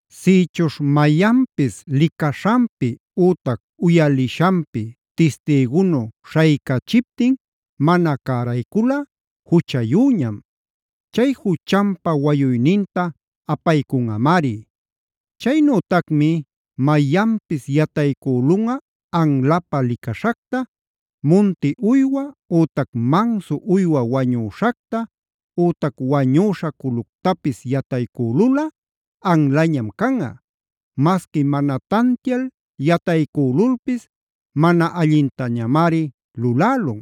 “Sïchuśh mayanpis licaśhanpi ütac uyalishanpi tistïgunu śhaycachiptin mana cärayculꞌa juchayüñam. Chay juchanpa wayuyninta apaycunꞌamari. “Chaynütacmi mayanpis yataycülunꞌa anlapä licaśhacta: munti uywa ütac mansu uywa wañüśhacta, ütac wañüśha culuctapis yataycülulꞌa anlañam canꞌa. Masqui mana tantial yataycülulpis mana allintañamari lulälun.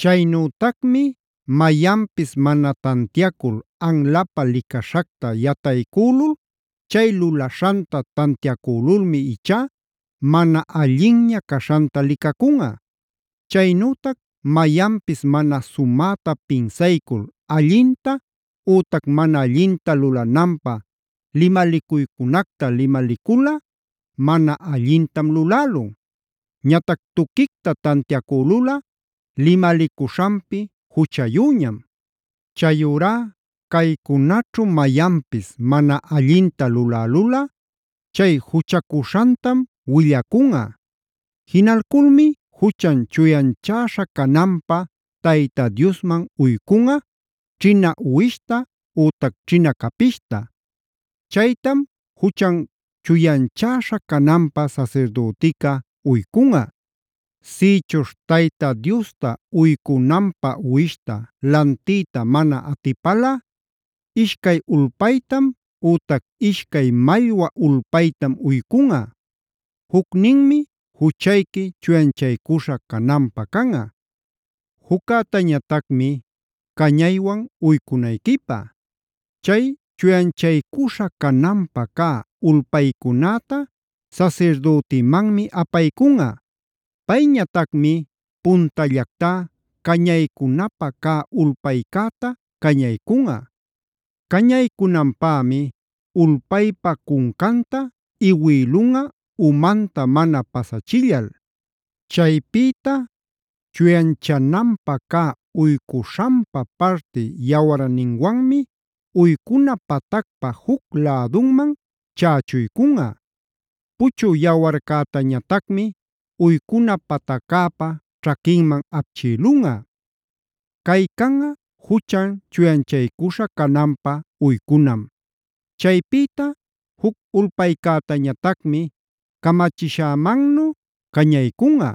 “Chaynütacmi mayanpis mana tantiacul anlapä licaśhacta yataycülunꞌa. Chay lulaśhanta tantiacülulmi ichá mana allinña caśhanta licacunꞌa. “Chaynütac mayanpis mana sumäta pinsaycul allinta ütac mana allinta lulananpä limalicuycunacta limaliculꞌa mana allintam lulälun. Ñatac tuquicta tantiacülulꞌa limalicuśhanpi juchayüñam. “Chayurá caycunaćhu mayanpis mana allinta lulälulꞌa chay juchacuśhantam willacunꞌa. Jinalculmi juchan chuyanchäśha cananpä Tayta Diosman uycunꞌa ćhina uwishta ütac ćhina capishta. Chaytam juchan chuyanchäśha cananpä sasirdütica uycunꞌa. “Sïchuśh Tayta Diosta uycunanpä uwishta lantiyta mana atipalꞌa ishcay ulpaytam ütac ishcay mallwa ulpaytam uycunꞌa. Jucninmi juchayqui chuyanchaycuśha cananpä canꞌa, juccätañatacmi cañaywan uycunayquipä. Chay chuyanchaycuśha cananpä cä ulpaycunäta sasirdütimanmi apaycunꞌa. Payñatacmi puntallactá cañaycunapä cä ulpaycäta cañaycunꞌa. Cañaycunanpämi ulpaypa cuncanta iwïlunꞌa umanta mana pasachillal. Chaypïta chuyanchananpä cä uycuśhanpa parti yawarninwanmi uycuna patacpa juc lädunman chächuycunꞌa. Puchü yawarcätañatacmi uycuna pataccäpa ćhaquinman apchïlunꞌa. Cay canꞌa juchan chuyanchaycuśha cananpä uycunam. Chaypïta juc ulpaycätañatacmi camachishämannu cañaycunꞌa.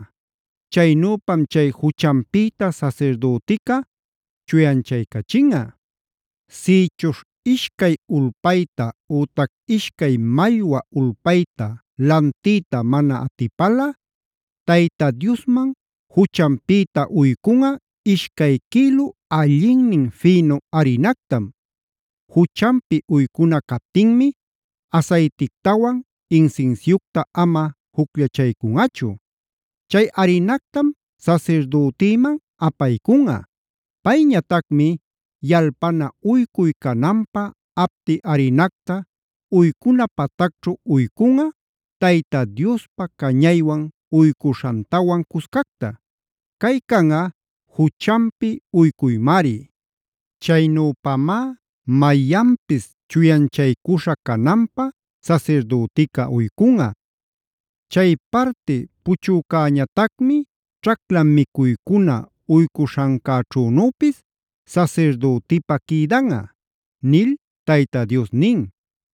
Chaynüpam chay juchanpïta sasirdütica chuyanchaycachinꞌa. “Sïchuśh ishcay ulpayta ütac ishcay mallwa ulpayta lantiyta mana atipalꞌa Tayta Diosman juchanpïta uycunꞌa ishcay quïlu allinnin fïnu arinactam. Juchanpi uycuna captinmi asaytictawan insinsiucta ama jucllachaycunꞌachu. Chay arinactam sasirdütïman apaycunꞌa. Payñatacmi yalpana uycuy cananpä apti arinacta uycuna patacćhu uycunꞌa, Tayta Diospa cañaywan uycuśhantawan cuscacta. Cay canꞌa juchanpi uycuymari. Chaynüpamá mayanpis chuyanchaycuśha cananpä sasirdütica uycunꞌa. Chay parti puchücäñatacmi ćhacla micuycuna uycuśhancäćhünüpis sasirdütipä quïdanꞌa” nil Tayta Dios nin.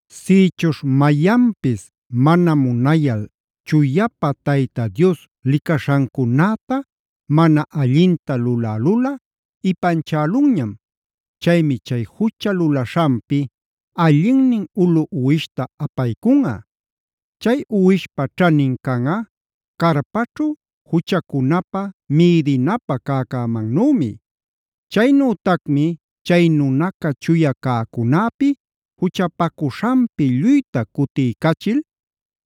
“Sïchuśh mayanpis mana munayal chuyapa Tayta Dios licaśhancunäta mana allinta lulälulꞌa ipanchälunñam. Chaymi chay jucha lulaśhanpi allinnin ulu uwishta apaycunꞌa. Chay uwishpa ćhanin canꞌa carpaćhu juchacunapä mïdinapä cäcämannümi. Chaynütacmi chay nunaca chuya cäcunäpi juchapacuśhanpi lluyta cutiycachil,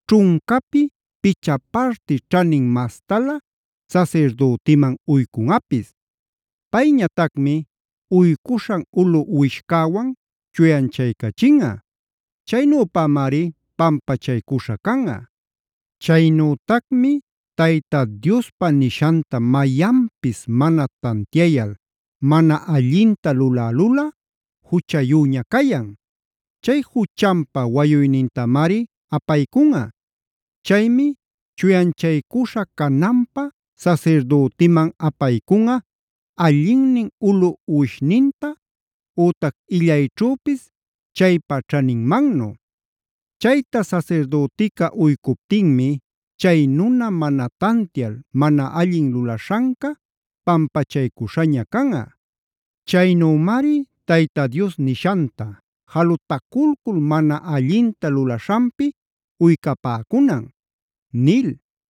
ćhuncapi picha parti ćhanin mastalä sasirdütiman uycunꞌapis. Payñatacmi uycuśhan ulu uwishcäwan chuyanchaycachinꞌa. Chaynüpamari pampachaycuśha canꞌa. “Chaynütacmi Tayta Diospa nishanta mayanpis mana tantiayal, mana allinta lulälulꞌa juchayüña cayan. Chay juchanpa wayuynintamari apaycunꞌa. Chaymi chuyanchaycuśha cananpä sasirdütiman apaycunꞌa allinnin ulu uwishninta; ütac illayćhüpis chaypa ćhaninmannu. Chayta sasirdütica uycuptinmi chay nuna mana tantial mana allin lulaśhanca pampachaycuśhaña canꞌa. Chaynümari Tayta Dios nishanta jalutaculcul mana allinta lulaśhanpi uycapäcunan” nil.